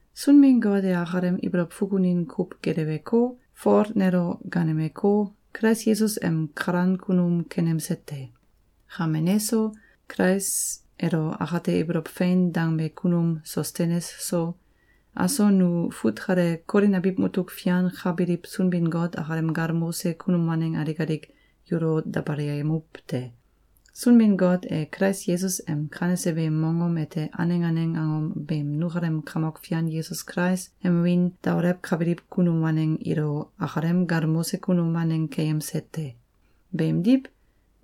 Sunbin-Got e akalem ibolow fukunin kuw geleweko, Fol nelo gaanemeko, Kulais Yesus em kalan kunum kenemse te. Kame neso, Kulais elo akate ibolow fein dangbe kunum Sostenes so, aso nu fut kale Kolin abiw mutuk fian ka biliw Sunbin-Got akalem galmose kunum waneng alik alik yulo dabalayemuw te. Sunbin-Got e Kulais Yesus em kanese beem mongom ete aneng aneng angom beem nukalem Kamok Fian Yesus Kulais em wiin daolewkabiliw kunum waneng ilo akalem galmose kunum waneng keyemse te. Beemdiw,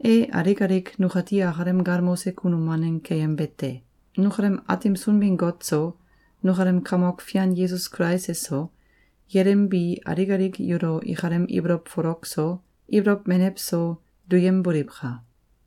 e alik alik nukati akalem galmose kunum waneng keyembe te. Nukalem Aatim Sunbin-Got so, nukalem Kamok Fian Yesus Kulais eso, yelim bi alik alik yulo ikalem ibolow folok so, ibolow menew so, duyemboliwka!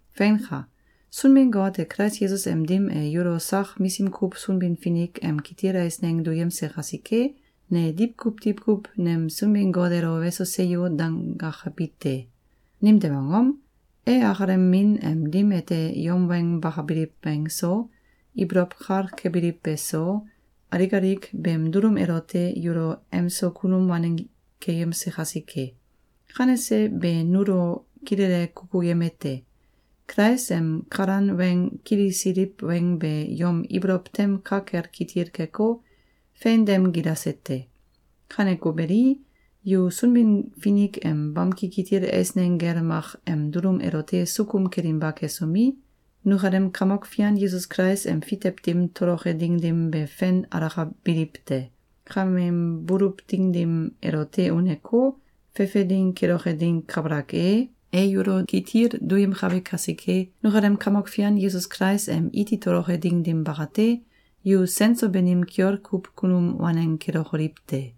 Feinka! Sunbin-Got e Kulais Yesus em dim e yulo sak misim kuw Sunbin-Finik em kitil eisneng duyemse kasike, ne diwkuw diwkuw nem Sunbin-Got elo “Weso! Seyo!”, dangakabi te. Nimtew angom? E akalem min em dim ete yom weng bakabiliw weng so, ibolow kal kebiliw beso, alik alik beem dulum elote yulo emso kunum waneng keyemse kasike. Kanese be nulo kilele kukuyemete: Kulais em kalan weng kilisiliw weng be yom ibolow tem ka kel kitil keko, fein dem gilase te. Kaneko beli, yu Sunbin-Finik em bamki kitil eisneng gel mak em dulum elote sukum kelinba kesomi, nukalem Kamok Fian Yesus Kulais em fitew dim toloke ding dim be fen alakabiliw te. Kameem buluw ding dim elote uneko, fefe ding keloke ding kabalak e, e yulo kitil duyemkabe kasike, nukalem Kamok Fian Yesus Kulais em iti toloke ding dim bakate, yu sen so banim kiol kuw kunum waneng kelokoliw te.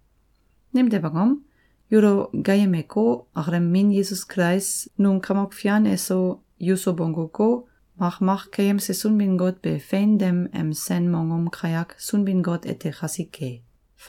Nimtew angom? Yulo gaayemeko, akalem Min Yesus Kulais num Kamok Fian eso, yuso bongguko, makmak keyemse Sunbin-Got be fein dem em sen mongom kayak Sunbin-Got ete kasike.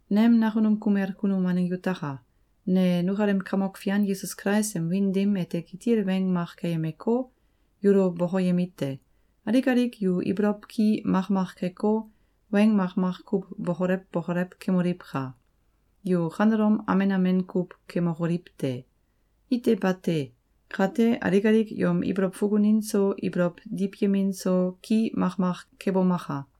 Nem nakunum kumel kunum waneng yutaka! Ne nukalem Kamok Fian Yesus Kulais em wiin dim ete kitil weng mak keyemeko, yulo bokoyemite: Alik alik yu ibolow ki makmak keko, weng makmak kuw bokolew bokolew kemoliwka! Yu kanelom amen amen kuw kemokoliw te! Ite bate! Kate, alik alik yom ibolow fukunin so, ibolow diwyemin so, ki makmak kebomaka!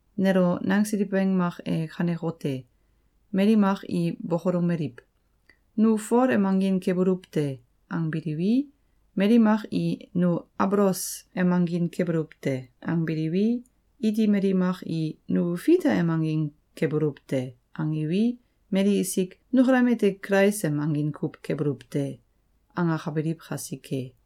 Nelo nangsiliw weng mak e kanekote: Mali mak i bokolomeliw: “Nu Fol em angin kebuluw te!”, angbiliwi, mali mak i “Nu Abolos em angin kebuluw te!”, angbiliwi, iti mali mak i “Nu Fita em angin kebuluw te!”, angiwi, mali isik “Nukalem ete Kulais em angin kuw kebuluw te!”, angakabiliw kasike.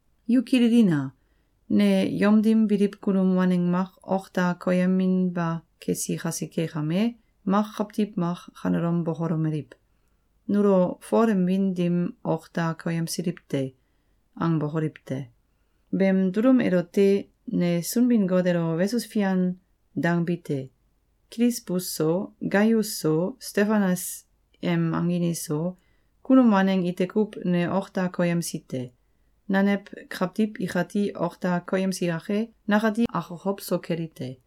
Yu kililina! Ne yom dim biliw kunum waneng mak ok da koyeminba kesi kasike kame, mak kawtiw mak kanelom bokolomeliw: “Nulo Fol em wiin dim ok da koyemsiliw te!”, angbokoliw te! Beem dulum elote ne Sunbin-Got elo “Weso fian!”, dangbi te. Kilisbus so, Gaius so, Stefanas em angin iso, kunum waneng ite kuw ne ok da koyemsi te. Nanew kawtiw ikati ok da koyemsi yake, nakati akokow so keli te.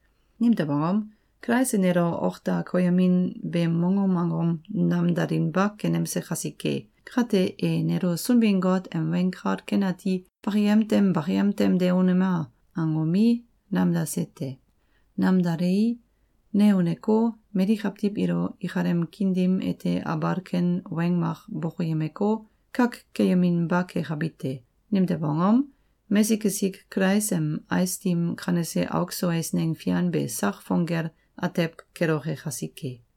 Nimtew angom? Kulais e nelo ok da koyemin beem mongom angom namdalinba kenemse kasike. Kate, e nelo Sunbin-Got em Weng Kal Ken Ati “Bakayem tem bakayem tem de unema!”, angomi, namdase te. Namdalei, ne uneko, mali kawtiw ilo ikalem kiin dim ete abal ken weng mak bokoyemeko, kak keyeminba kekabi te. Nimtew angom? Mesik esik Kulais em ais dim kanese auk so eisneng fian be sak sang fong gel atew keloke kasike.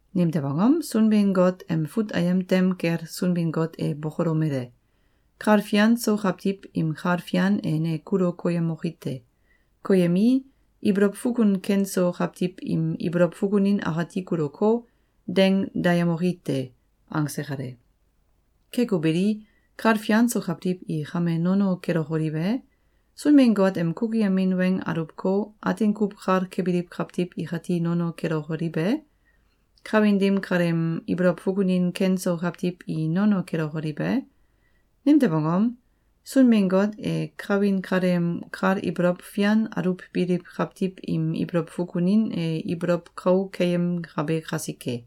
Nimtew angom? Sunbin-Got em fut ayem tem kel Sunbin-Got e bokolomele: “Kal fian so kawtiw im kal fian e ne kulu koyemoki te. Koyemii, ibolow fukun ken so kawtiw im ibolow fukunin akati kuluko, deng dayemoki te.”, angse kale. Keko beli, kal fian so kawtiw i kame nono kelokoliw e? Sunbin-Got em kukuyemin weng aluwko, atin kuw kal kebiliw kawtiw ikati nono kelokoliw e? Kawin dim kaleem ibolow fukunin ken so kawtiw i nono kelokoliw e? Nimtew angom? Sunbin-Got e kawin kaleem kal ibolow fian aluwbiliw kawtiw im ibolow fukunin e ibolow kau keyemkabe kasike.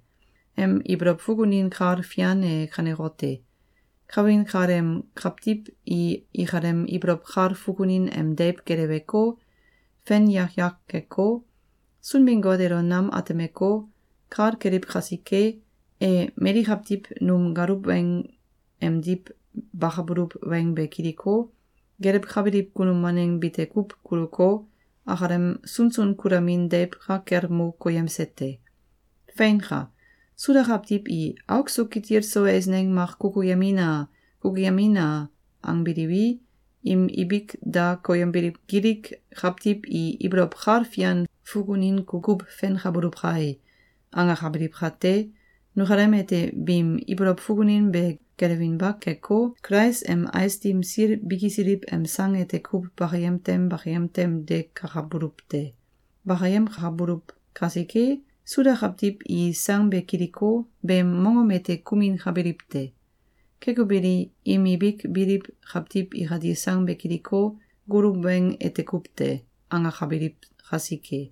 Em ibolow fukunin kal fian e kanekote: Kawin kaleem kawtiw i ikalem ibolow kal fukunin em deiw geleweko, fen yak yak keko, Sunbin-Got elo nam atemeko, kal keliw kasike, e mali kawtiw num galuw weng emdiw bakabuluw weng be kiliko, gelewkabiliw kunum waneng bite kuw kuluko, akalem sunsun kulamin deiw ka kel mo koyemse te. Feinka! Suda kawtiw i “Auk so kitil so eisneng mak kukuyemina! Kukuyemina!”, angbiliwi, im ibik da koyembiliw Gilik kawtiw i “Ibolow kal fian fukunin kukuw fenkabuluw kai!”, angakabiliw kate, nukalem ete biim ibolow fukunin be geleweinba keko, Kulais em ais dim sil bikisiliw em sang ete kuw bakayem tem bakayem tem de kakabuluw te. Bakayemkabuluw kasike, Suda kawtiw i sang be kiliko, beem mongom ete kuminkabiliw te. Keko beli, im ibik biliw kawtiw ikati sang be kiliko, “Goluw weng ete kuw te!”, angakabiliw kasike.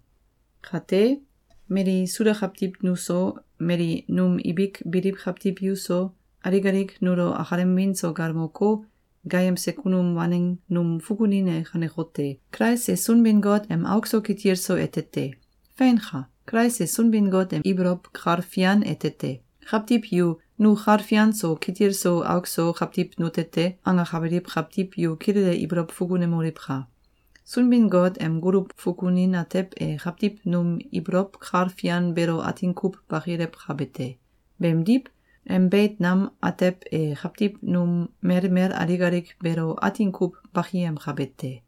Kate, mali Suda kawtiw nuso, mali num ibik biliw kawtiw yuso, alik alik nulo akalem wiin so galmoko, gaayemse kunum waneng num fukunin e kanekote: Kulais e Sunbin-Got em auk so kitil so ete te! Feinka! Kulais e Sunbin-Got em ibolow kal fian ete te! Kawtiw yu “Nu kal fian so, kitil so auk so kawtiw nute te!”, angakabiliw kawtiw yu kilele ibolow fukunemoliwka! Sunbin-Got em goluw fukunin atew e kawtiw num ibolow kal fian beelo atin kuw bakilewkabe te. Beemdiw, em beit nam atew e kawtiw num melmel alik alik beelo atin kuw bakiyemkabe te.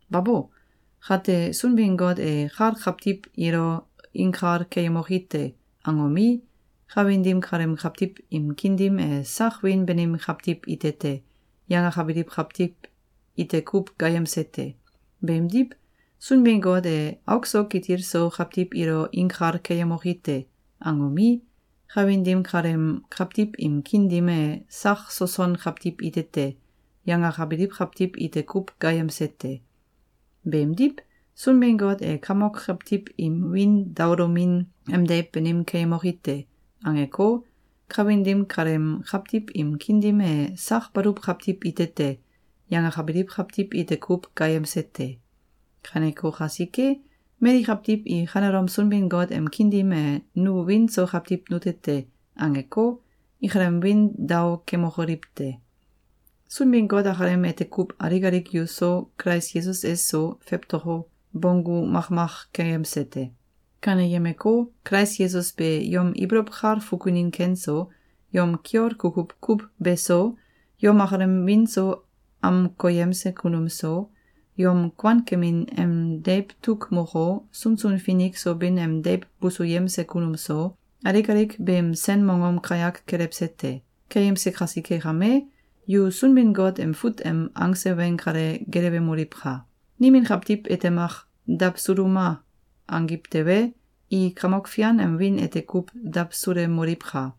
Babo! Kate, Sunbin-Got e “Kal kawtiw ilo inkal keyemoki te!”, angomi, kawin dim kaleem kawtiw im kiin dim e “Sak wiin banim kawtiw ite te!”, yangakabiliw kawtiw ite kuw gaayemse te. Beemdiw, Sunbin-Got e “Auk so kitil so kawtiw ilo inkal keyemoki te!”, angomi, kawin dim kaleem kawtiw im kiin dim e “Sak soson kawtiw ite te!”, yangakabiliw kawtiw ite kuw gaayemse te. Beemdiw, Sunbin-Got e “Kamok kawtiw im wiin daolomin em deiw banim keyemoki te!”, angeko, kawin dim kaleem kawtiw im kiin dim e “Sak baluw kawtiw it te!”, yangakabiliw kawtiw ite kuw gaayemse te. Kaneko kasike, mali kawtiw i kanelom Sunbin-Got em kiin dim e “Nu wiin so kawtiw nute te!”, angeko, ikalem wiin dao kemokoliw te! Sunbin-Got akalem ete kuw alik alik yuso, Kulais Yesus eso, fewtoko, bonggu makmak keyemse te. Kaneyemeko, Kulais Yesus be yom ibolow kal fukunin ken so, yom kiol kukuw kuw beso, yom akalem wiin so amkoyemse kunum so, yom kuankemin em deiw tuk moko, sunsun finik so bin em deiw busuyemse kunum so, alik alik beem sen mongom kayak kelewse te. Keyemse kasike kame, yu Sunbin-Got em fut em angse weng kale gelewemoliwka! Nimin kawtiw ite mak “Dawsuluma!”, angiw tewe, i Kamok Fian em wiin ete kuw dawsulemoliwka!